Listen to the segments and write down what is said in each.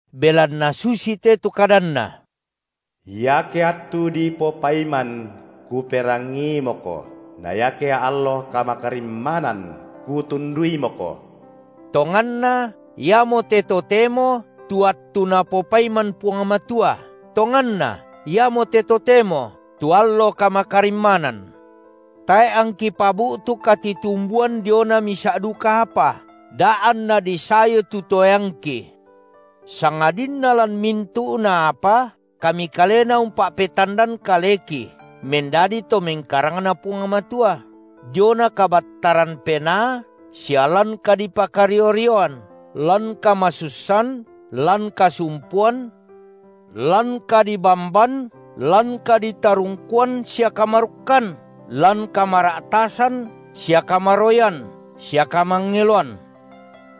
Belanna susite tu kadanNa: Iake attu dipopaiman Kuperangiimoko, na iake allo kamakarimmanan Kutunduimoko. Tonganna iamote totemo tu attu Napopaiman Puang Matua, tonganna iamote totemo tu allo kamakarimmanan. Tae’ angki pabu’tu katitumbuan diona misa’ duka apa, da anna disayu tu toeangki. Sangadinna lan mintu’na apa, kami kalena umpa’petandan kaleki mendadi to mengkarangNa Puang Matua, diona kabattaran penaa sia lan kadipakario-rioan, lan kamasussan lan kasumpuan, lan kadibamban, lan kaditarungkuan sia kamarukkan, lan kamara’tasan, sia kamaroyan sia kamangeloan;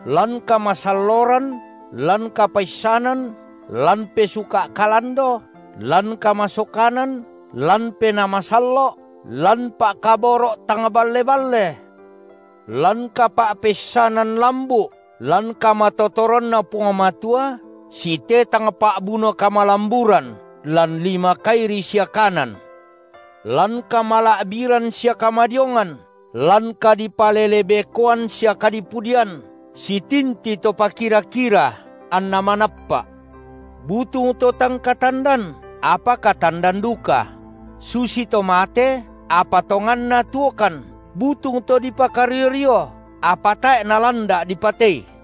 lan kamasalloran, lan kapaissanan, lan pesuka’ kalando, lan kamasokanan, lan Penaa Masallo’, lan pa’kaboro’ tang balle-balle, lan kapa’peissanan lambu’ lan kamatotoranNa Puang Matua, sitetang pa’buno kamalamburan lan lima kairi sia kanan, lan kamala’biran sia kamadiongan, lan kadipalele-bekoan sia kadipudian, sitinti to pakira-kira anna manappa’, butung to tang katandan, apa katandan duka; susito mate, apa tonganna tuokan, butung to dipakario-rio, apa tae’ nalanda’ dipatei;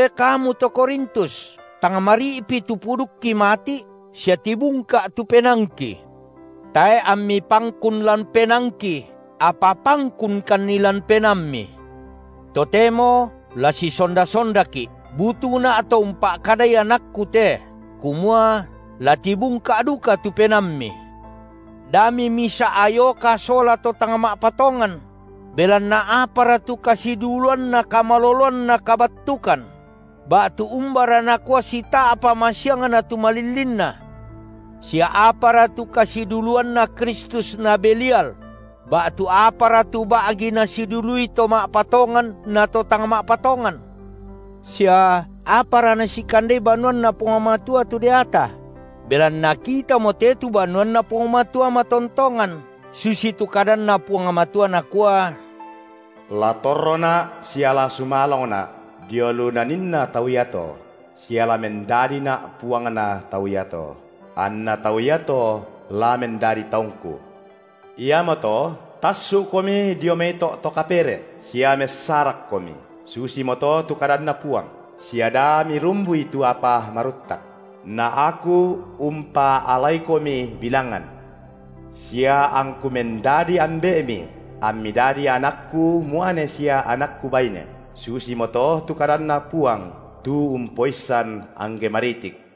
E kamu to Korintus, tang mari’pi tu pudukki mati’ sia tibungka’ tu penaangki. Tae’ ammi pangkun lan penaangki, apa pangkunkanni lan penaammi. Totemo la sisonda-sondaki’ – butungna’ to umpa’kadai anakku te kumua: la tibungka’ duka tu penaammi. Da mimisa’ ayoka sola to tang ma’patongan; belanna apara tu kasiduluanna kamaloloan na kabattukan? ba’tu umbara nakua sita’pa masiangna tu malillinna? Sia apara tu kasiduluanNa Kristus na Belial? ba’tu apara tu ba’gi nasidului to ma’patongan na to tang ma’patongan? Sia apara nasikandei banuanNa Puang Matua tu deata? Belanna kitamote tu banuanNa Puang Matua matontongan, susitu kadanNa Puang Matua, Nakua: La torroNa’ sia la sumalongNa’ dio lu naninna tau iato, sia la mendadiNa’ Puangna tau iato, anna tau iato la mendadi taungKu. Iamoto tassu’komi dio mai to’ to kapere’, sia messarakkomi, susimoto tu kadanNa Puang, sia da mirumbui tu apa maruttak; na Aku umpaalaikomi bilangan, sia angKu mendadi Ambe’mi, ammi dadi anakKu muane sia anakKu baine, susimoto tu kadanNa Puang tu Umpoissan angge maritik.